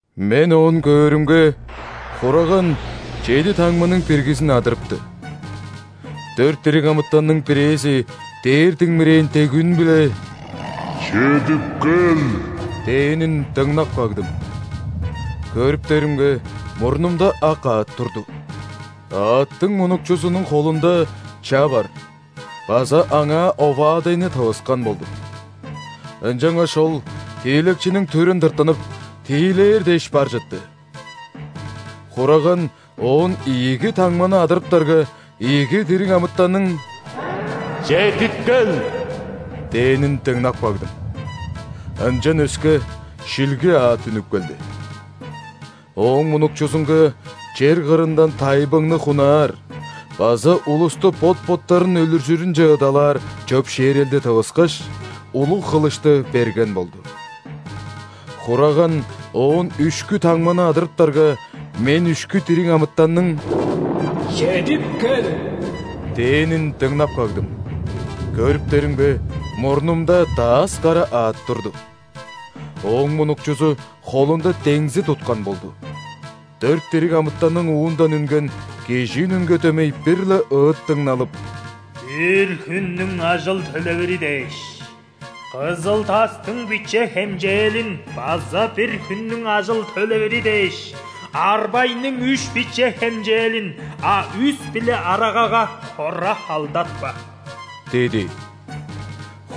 Мен оон көөрүмге, Хураган чеди таңманың биргизин адырыпты. Дөрт дириг амытанның бирээзи дээр диңмирээн дег үн-биле: «Чедип кел!» – дээнин дыңнап кагдым. Көрүптеримге, мурнумда ак аът турду. Аъттың мунукчузунуң холунда ча бар база аңаа оваадайны тывыскан болду. Ынчангаш ол тиилекчиниң түрүн тыртынып, тиилээр дээш бар чытты. Хураган оон ийиги таңманы адырыптарга, ийиги дириг амытанның: «Чедип кел!» – дээнин дыңнап кагдым. Ынчан өске, шилги аът үнүп келди. Ооң мунукчузунга чер кырындан тайбыңны хунаар база улусту бот-боттарын өлүржүрүнче ыдалаар чөпшээрелди тывыскаш, улуг хылышты берген болду. Хураган оон үшкү таңманы адырыптарга, мен үшкү дириг амытанның: «Чедип кел!» – дээнин дыңнап кагдым. Көрүптеримге, мурнумда дас кара аът турду. Ооң мунукчузу холунда деңзи туткан болду. Дөрт дириг амытанның уундан үнген, кижи үнүнге дөмей бир-ле ыыт дыңналып: «Бир хүннүң ажыл төлевири дээш – кызыл-тастың биче хемчээлин, база бир хүннүң ажыл төлевири дээш – арбайның үш биче хемчээлин, а үс биле арагага хора халдатпа!» – диди.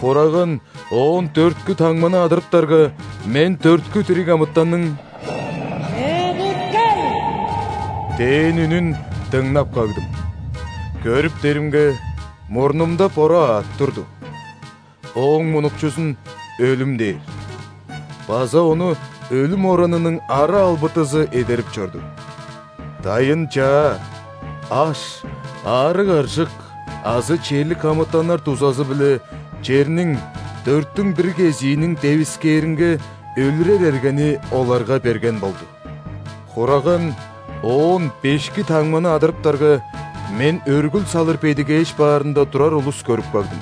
Хураган оон дөрткү таңманы адырыптарга, мен дөрткү дириг амытанның: «Чедип кел!» – дээн үнүн дыңнап кагдым. Көрүптеримге, мурнумда бора аът турду. Ооң мунукчузун «Өлүм» дээр база ону өлүм оранының ара-албатызы эдерип чорду. Дайын-чаа, аш, аарыг-аржык азы черлик амытаннар дузазы-биле черниң дөрттүң бир кезииниң девискээринге өлүрер эргени оларга берген болду. Хураган оон бешки таңманы адырыптарга, мен өргүл салыр бедигээш баарында турар улус көрүп кагдым,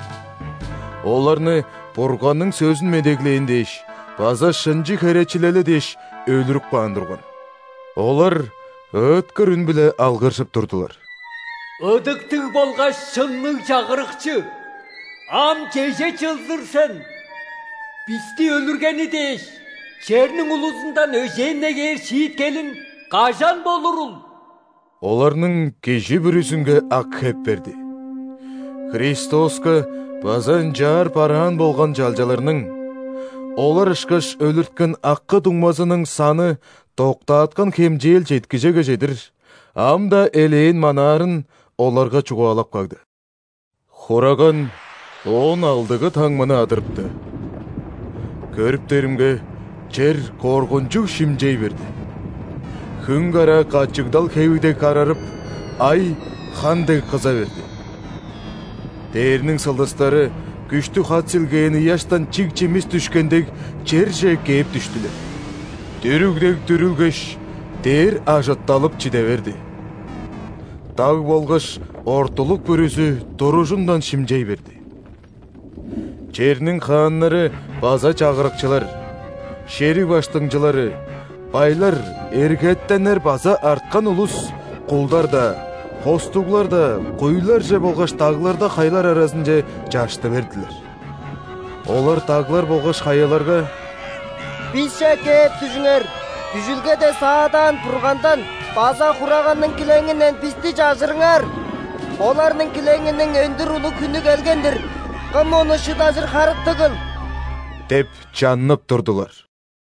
оларны Бурганның сөзүн медеглээн дээш база шынчы херечилели дээш, өлүрүп каан турган. Олар ыыткыр үн-биле алгыржып турдулар: «Ыдыктыг болгаш шынныг Чагырыкчы, ам чеже чылзыр сен?! Бисти өлүргени дээш, черниң улузундан өжээн негээр шииткелиң кажан болурул?!» Оларның кижи бүрүзүнге ак хеп берди. Христоска база ынчаар бараан болган чалчаларның – олар ышкаш өлүрткен акы-дуңмазының саны доктааткан хемчээл четкижеге чедир, ам-даа элээн манаарын оларга чугаалап кагды. Хураган оон алдыгы таңманы адырыпты. Көрүптеримге, чер коргунчуг шимчей берди. Хүн караа качыгдал хеви дег карарып, ай хан дег кыза берди. Дээрниң сылдыстары, күштүг хат силгээн ыяштан чиг чимис дүшкен дег, черже кээп дүштүлер. Дүрүг дег дүрүлгеш, дээр ажытталып чиде берди. Даг болгаш ортулук бүрүзү туружундан шимчей берди. Черниң хааннары база чагырыкчылар, шериг баштыңчылары, байлар, эргетеннер база арткан улус – кулдар-даа, хостуглар-даа куйларже болгаш дагларда хаялар аразынче чашты бердилер. Олар даглар болгаш хаяларга: «Бисче кээп дүжүңер, дүжүлгеде саадаан Бургандан база Хураганның килеңинден бисти чажырыңар! Оларның килеңиниң өндүр улуг хүнү келген-дир, кым ону шыдажыр харыктыгыл?» – деп чаннып турдулар.